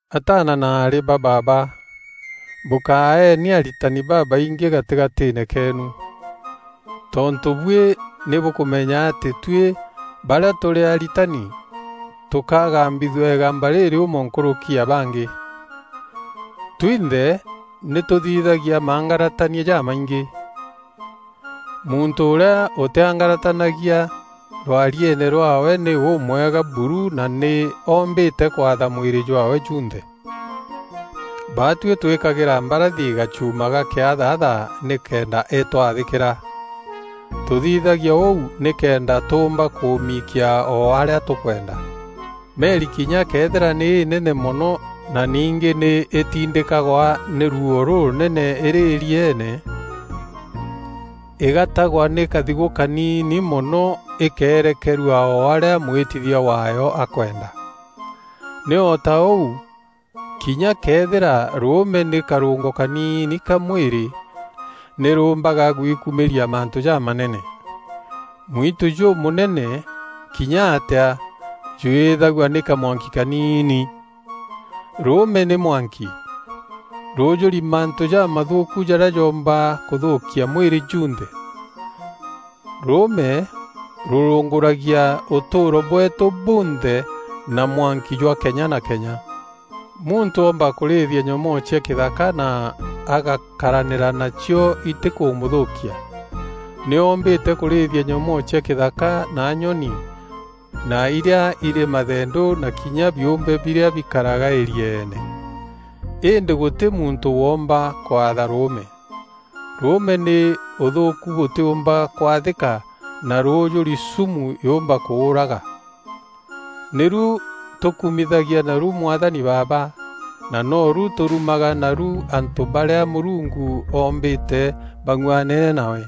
Ataana na aarî ba baaba, bûkaeeni aritani babaingî gatîgatîîne keenu. Tontû buî nî bûkûmenya atî tuî barîa tûrî aritani tûkagambithua îgamba rîrîûmo nkûrûki ya bangî. Twinthe nî tûthithagia maangaratania jamaingî. Muntû ûrîa ûtîangaratanagia rwarieene rwaawe nî ûmwega buru na nî oombîte kwatha mwîrî jwaawe junthe. Baatuî twîkagîra mbarathi gacuuma ga kîathatha nîkenda îtwathîkîra. Tûthithagia ûu nîkenda tûûmba kûmiikia o arîa tûkwenda. Meri kinya këethîra nî înene mono na ningî nî îtindîkagwa nî ruuo rûrûnene îrî îrieene, îgatagwa nî kathigû kaniini mono îkeerekerua o arîa mwîtithia waayo akwenda. Nî o ta ûu, kinya këethîra rûûme nî karûngo kaniini ka mwîrî nî rûûmbaga gwikumîria mantû jamanene. Mwitû jûmûnene kinya atîa jwîîthagua nî kamwanki kaniini! Rûûme nî mwanki. Rûûjûri mantû jamathûûku jarîa joomba kûthûkia mwîrî junthe. Rûûme rûrûngûragia ûtûûro bweetû bunthe na mwanki jwa kenya na kenya. Muntû oomba kûrîîthia nyomoo cia kîthaka na agakaranîria nacio itîkûmûthûkia. Nî oombîte kûrîîthia nyomoo cia kîthaka na nyoni na irîa îrî mathendû na kinya biûmbe birîa bikaraga îrieene. Îndî gûtî muntû woomba kwatha rûûme. Rûûme nî ûthûûku bûtîûmba kwathîka na rûûjûri sumu yûûmba kûûraga. Nîru tûkumithagia naru Mwathani Baaba, na noru tûrumaga naru antû barîa Mûrungu oombîte bang'uanene nawe.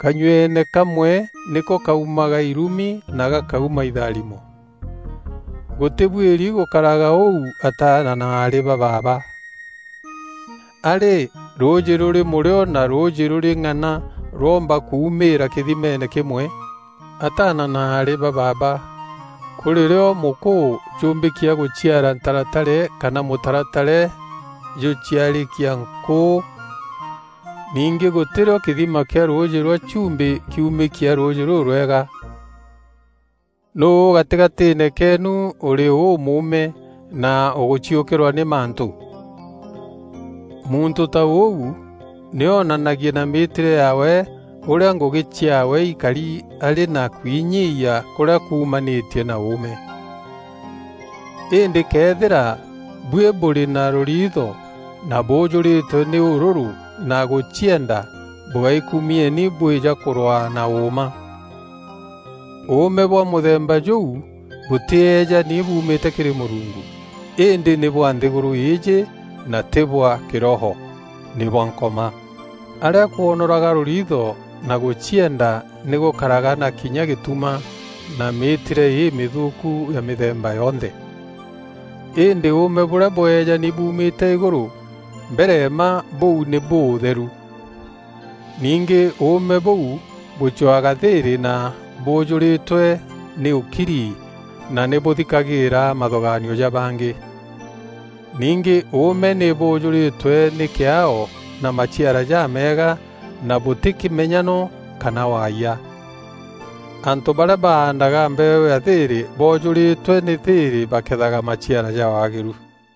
Kanyueene kamwe nîko kaumaga irumi na gakauma itharimo. Gûtîbuîri gûkaraga ûu ataana na aarî ba baaba. A rî rûûjî rûrî mûrîo na rûûjî rûrî ng'ana rwoomba kuumîîra kîthimeene kîmwe? Ataana na aarî ba baaba, kûrî rîo mûkûû jûûmbîkia gûciara ntaratare kana mûtaratare jûciarîkia nkûû? Ningî gûtî rîo kîthima kîa rûûjî rwa chumbî kiumîkia rûûjî rûrwega. Nûû gatîgatîîne keenu ûrî ûûmûme na ûgûciûkîrwa nî mantû? Muntû ta ûu nî onanagie na mîîtîre yaawe ûrîa ngûgî ciaawe ikari arî na kwinyiiyia kûrîa kuumanîtie na ûûme. Îndî këethîra buî bûrî na rûriitho na bûûjûrîtwe nî ûrûrû na gûcienda bûgaikumieni bwîja kûrwaa na ûûma. Ûûme bwa mûthemba jûu bûtîejani buumîte kîrî Mûrungu, îndî nî bwa nthîgûrû îîjî na tî bwa kîroho, nî bwa Nkoma. Arîa kwonoraga rûriitho na gûcienda nî gûkaraga na kinya gîtuma na mîîtîre îmîthûûku ya mîthemba yonthe. Îndî ûûme bûrîa bweejani buumîte îgûrû, mbere mma bûu nî bûûtheru. Ningî ûûme bûu bûcwaga thîîrî na bûûjûrîtwe nî ûkiri na nî bûthikagîîra mathûgaanio ja bangî. Ningî ûûme nî bûûjûrîtwe nî kîaao na maciara jameega na bûtî kîmenyano kana waayia. Antû barîa baandaga mbeeû ya thîîrî boojûrîtwe nî thîîrî bakethaga maciara ja waagîru.